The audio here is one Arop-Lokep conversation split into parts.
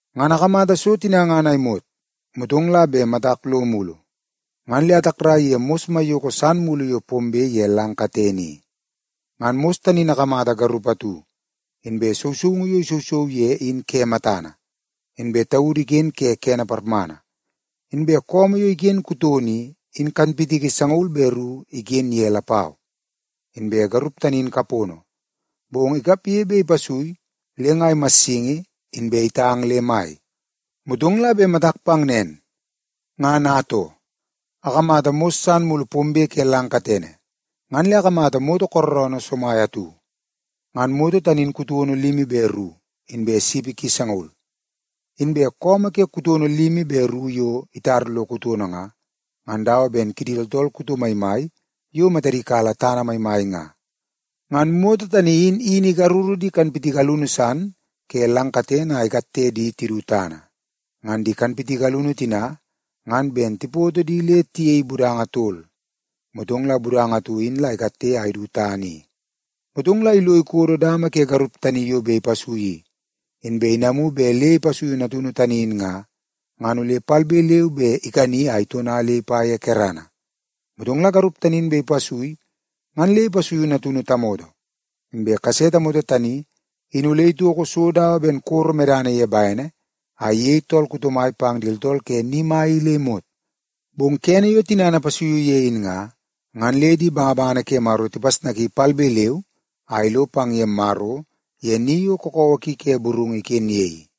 Ngan akamata so tina ngan a imot, motong la bet matak lo mulu, ngan le atakrai ye mos maiyoko san mulu yo pombe ye lang katene i. Ngan mos tani in akamata garup atu, inbe sousoungu yo isousou ye in ke matana, inbe taudu iken ke kene parmana. Inbe su yo iken ye kutono i, in kanpitiki sangaul be ru iken ye lapau. Inbe garup tani in kapono, bong ikapge bet ipasui le nga imassingi, inbe itang le mai. Motong la bet matak pang nen, ngan atoo, akamata mos san mulu pombe ke lang katene, ngan le akamata moto kooroonoo somai atu. Ngan moto tani in kutono limi be ru, inbe sipi ki sangaul. Inbe su ke kutono limi be ru yo itar lo kutono nga, ngan dawa ben kidi tooltool kuto maimai yo matadi kala tana maimai nga. Ngan moto tani in wini ikaruru di kanpitiki alunu san ke lang katene a ikatte di tidu tana. Ngan di kanpitiki alunu tina ngan ben tipoto di le tiyei budanga tol, motong la budanga atu in la ikatte a idu tana i. Motong la ilo ikodo dama ke garup tani yo bet ipasui i, inbe inamu bet le ipasuiu natunu tani in nga, ngan ole palbe leu be ikani a itona le ipa ye kerana. Motong la garup tani in bet ipasui ngan le ipasuiu natunu tamoto. Inbe kase tamoto tani in ole itoko so dawa ben koro medana ye bene a iyei tool kuto mai pang di tooltool ke ni mai i le imot. Bong kene yo tinana ipasuiu ye in nga, ngan le di bangabangana ke Maro tipasnaki palbe leu a ilo pang ye Maro ye ni yo kakawa ki ke burungu iken ye i.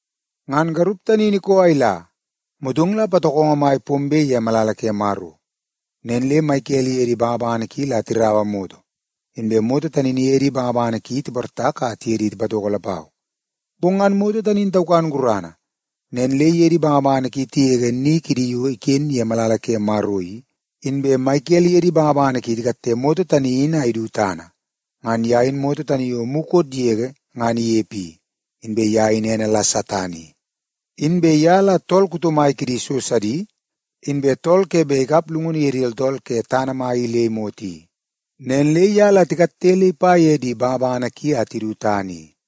Ngan garup tani in ikoo a ila, motong la patokongo mai pombe ye malala ke Maro. Nen le Mikel iye di bangabangana ki la tiraua moto, inbe moto tani in iye di bangabangana ki tiportak a tiye di tipatoko lapau. Bong ngan moto tani in taukan gurana, nen le iye di bangabangana ki tigege ni kidi yo iken ye malala ke Maro i, inbe Mikel iye di bangabangana ki tikatte moto tani in a idu tana. Ngan ye in moto tani yo mukot yege ngan inepe i, inbe ye in ene la Satan i. Inbe ye la tool kuto mai kidi so sidi, inbe tool ke bet ikap llungunu ye di tooltool ke tana mai i le imot i. Nen le ye la tikatte le ipa ye di bangabangana ki a tidu tana i.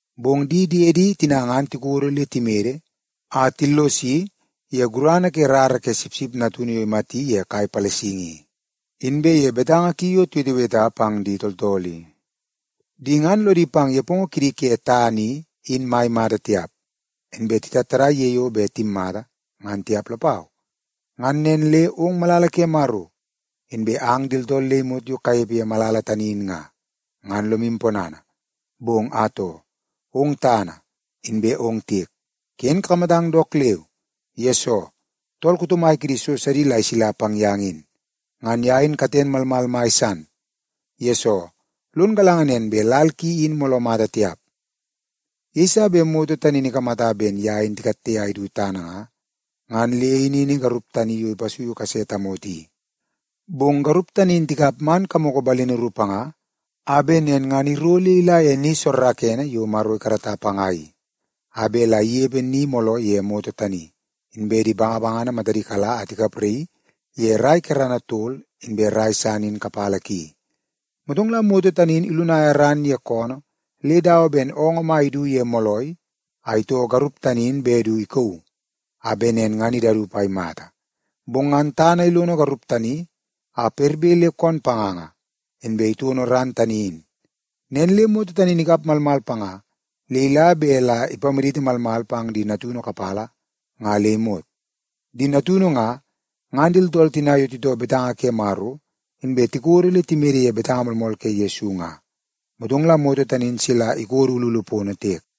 Bong di diede tina ngan tikodo le timede a tillosi ye gurana ke rara ke Sipsip Natunu yo imati ye kai palasingi i, inbe ye betanga ki yo tiweteweta pang di tooltool i. Di ngan lodi pang nepongo kidi ke tana in mai mata tiap, inbe titattadai ye yo bet timmata, ngan tiap lapau. Ngan nen le ong malala ke Maro, inbe ang di tooltool le imot yo kanepe ye malala tani in nga, ngan lomu ponana. Bong atoo, ong tana inbe ong tiek, ken kakamatang dook leu, yesoo tool kuto mai kidi so sidi la isila pang yang in. Ngan ye in katen malmal mai san, yesoo lon galanga nen bet lal ki in mooloo mata tiap.” Yeiso bet moto tani in ikamata ben ye in tikatte a idu tana nga, ngan le inini garup tani yo ipasuiu kase tamoto i. Bong garup tani in tikap man kamoko balini ru panga a bet nen ngan iro le ila ye ni soorookoonoo yo Maro ikarata panga i, a bet la inepe ni mooloo ye moto tani, inbe di bangabangana matadi kala a tikapraii ye rai kerana tol inbe rai san in kapala ki. Motong la moto tani in ilunaia ran ye koonoo le dawa ben oongoo mai idu ye moolai a itoo garup tani bet du ikauu a bet nen ngan idaup a imata. Bong ngan tana ilono garup tani a perbe le koon panganga, inbe itono ran tani in. Nen le moto tani in ikap malmal panga le ila bet la ipamaditi malmal pang di natunu kapala nga le imot. Di natunu nga, ngan di tooltool tina yo titoo betanga ke Maro inbe tikodo le timede ye betanga moolmool ke Yesu nga. Motong la moto tani in sila ikodo ululu pono tiek.